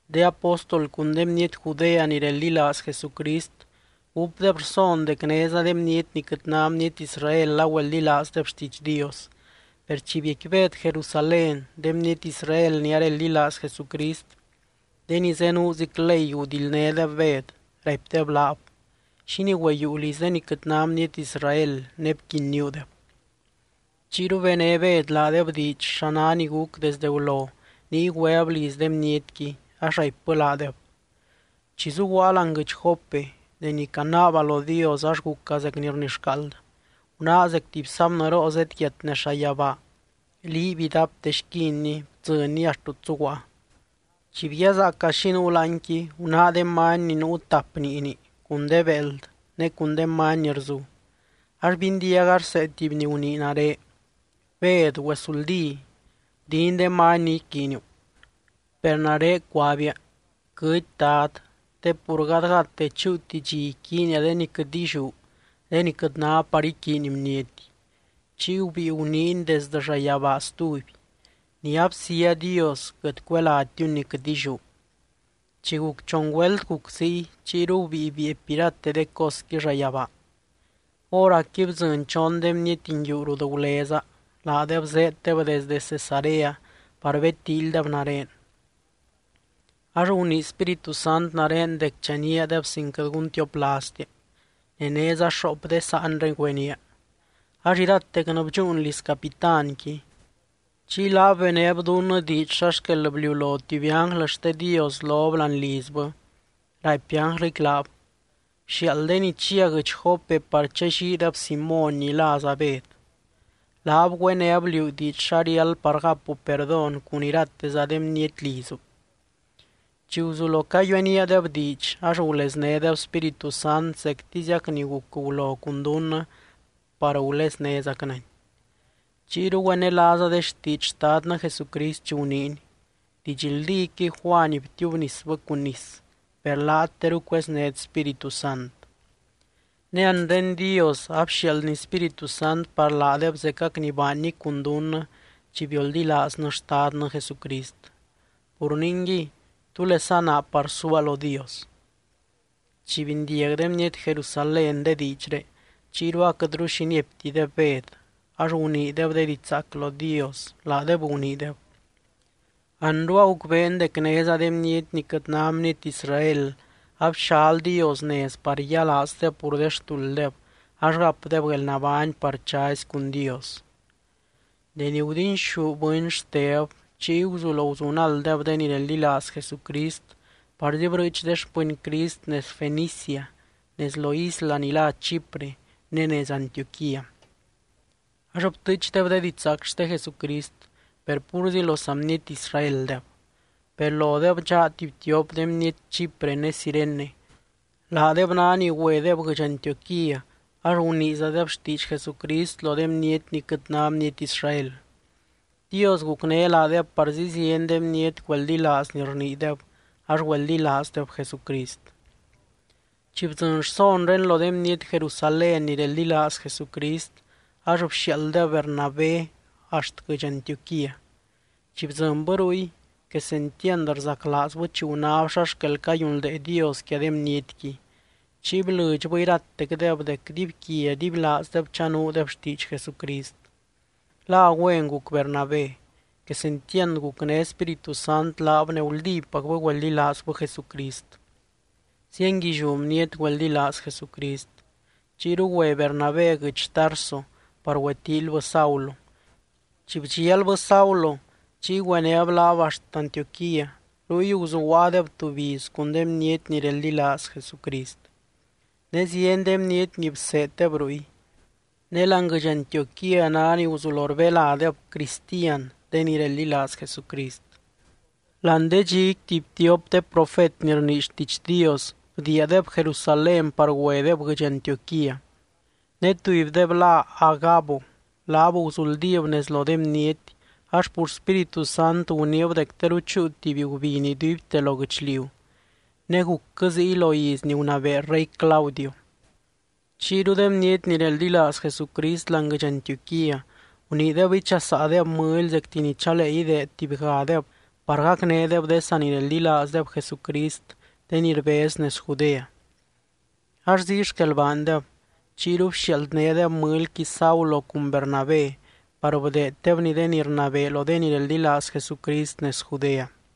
De apóstol cun de bniety Judea ni reldilaaz Jesucrist gúpdeb rson dec néza de bniety ni quɨt ná bniety Israel agüeldilaazdeb xtiidx Dios. Per chi biecqui Bed Jerusalén, de bniety Israel ni areldilaaz Jesucrist, de ni zenuuzic ley gudildnédeb Bed, raipdeb laab: —¿Xínii güeyiiu liz de ni quɨt ná bniety Israel, ne bquinníudeb? Chiyru bené Bed laadeb diidx, xa ná ni guc desde gulo niy güeb liz de bnietqui, ax raipbɨ laadeb: —Chi zuguaa láani guɨdx Jope, deni canaaba lo Dios, ax guca zec ni rnixcaald. Gunáa zec tuby sábnɨroo zedyiat nez llayabaa liiby idapte xquinni bdzɨnni axt rut zuguaa. Chi bguiazaaca xi nuu láanqui, gunáa de many ni nuu tap niini, cun de béeld ne cun de many ni rzu. Ax bindiaga rsee tuby ni gunii nare: “Bed, güesuldí. Gudin de many ni iquiiniu.” Per nare cuabia: “Quɨty, Dad, te pur gadgadte chúuti dxi iquiinia de ni quɨt illiú, de ni quɨt ná par iquiiny bniety.” Chiy gubíi guniiny desdɨ llayabaa stuby: “Ni absía Dios, quɨt cuelátiuni ni quɨt illiú.” Chi guc chon güelt guc ziy, chiyru gubíi bieepy irate de cosqui llayabaa. Hóracqui bdzɨny chon de bniety nguiu rut guleza. Laadeb zéeddeb desdɨ Cesarea par bedtíilydeb nare. Ax gunii Spíritu Sant nare dec chaníadeb sin quɨt guntioplaaztia. Ne néza xoop de saanré güenía. Ax iratecnɨ bdxúun liz capitánqui. Chiy laab benéb dunnɨ diidx xa xquel bliulo tuby ánglɨ xte Dios lob láani lizbɨ, raipy ánglɨqui laab: “Bxiaald de ni chia guɨdx Jope par challiideb Simóny ni láza Bed. Laab güéneb liú diidx xa riáld par gacu perdón cun irateza de bniety lizu.” Chi guzulo cayueníadeb diidx ax guleznédeb Spíritu Sant zectiziac ni guc gulo cun dunnɨ par guleznézacnɨny. Chiyru güenelaaza de xtiidx Xtadnɨ Jesucrist chi guniiny: “Didxldíquɨy Juany btiubnisbɨ cun nis, per laat teru cueznét Spíritu Sant.” Ne anre Dios a bxiaaldny Spíritu Sant par laadeb zecac ni baanny cun dunnɨ chi bioldilaaznɨ Xtadnɨ Jesucrist. Pur ningui, ¿túlesa naa par suaa lo Dios? Chi bindiag de bniety Jerusalén de diidxré, chiyru aquɨtru xi nieptideb Bed, ax guniideb de diidx zaac lo Dios, laadeb guniideb: —¡Anru agucbeen dec néza de bniety ni quɨt ná bniety Israel abxal Dios nez par yialaazdeb pur de xtulddeb ax gapdeb guelnabány par chazy cun Dios! Deni gudinxú bɨny Xteb, chiy guzulo guzunalddeb de ni reldilaaz Jesucrist parzi brɨɨch de xpɨny Crist nez Fenicia, nez lo isla ni lá Chipre ne nez Antioquía. Ax btɨɨchdeb de didxzaac xte Jesucrist, per púrzi lo saa bniety Israeldeb. Per lodeb dxaa tuby tiop de bniety Chipre ne Cirene. Laadeb ná ni güedeb guɨdx Antioquía, ax guniizadeb xtiidx Jesucrist lo de bniety ni quɨt ná bniety Israel. Dios gucné laadeb parzi zieny de bniety güeldilaaz ni rniideb, ax güeldilaazdeb Jesucrist. Chi bdzɨny rsonré lo de bniety Jerusalén ni reldilaaz Jesucrist, ax bxiaalddeb Bernabé axt guɨdx Antioquía. Chi bdzɨnbɨ ruy, quesentiand rzaclaazbɨ chi gunáb xa xquel cayunldee Dios quia de bnietqui, chiy blɨdxbɨ iratecdeb dec dibyquia dibylaazdeb chanuudeb xtiidx Jesucrist. La güen guc Bernabé. Quesentiand gucné Spíritu Sant laab ne guldípacbɨ güeldilaazbɨ Jesucrist. Zienguilliú bniety güeldilaaz Jesucrist. Chiyru güe Bernabé guɨdx Tarso par güetíilybɨ Saulo. Chi bdxialbɨ Saulo, chiy güenéb laab axt Antioquía. Ruy guzuguaadeb tuby iz cun de bniety ni reldilaaz Jesucrist. Ne zieny de bniety ni bseeddeb ruy. Ne láani guɨdx Antioquía ná ni guzulo rbeládeb “Cristian” de ni reldilaaz Jesucrist. Láani de dxiqui tuby tiop de profet ni rnii xtiidx Dios bdiiadeb Jerusalén par güedeb guɨdx Antioquía. Ne tubydeb lá Agabo. Laab guzuldíb nez lo de bniety, ax pur Spíritu Sant guniib dec teru chúu tuby gubiny iduibte lo guɨchliu. Ne gucquɨ ziy lo iz ni gunabee rey Claudio. Chiyru de bniety ni reldilaaz Jesucrist láani guɨdx Antioquía guniideb ichasaadeb mɨly zecti ni chalee ideed tubygadeb par gacnédeb de sanireldilaazdeb Jesucrist, de ni rbez nez Judea. Ax ziy xquel baandeb. Chiyru bxialdnédeb mɨlyqui Saulo cun Bernabé par bdeeddebni de ni rnabee lo de ni reldilaaz Jesucrist nez Judea.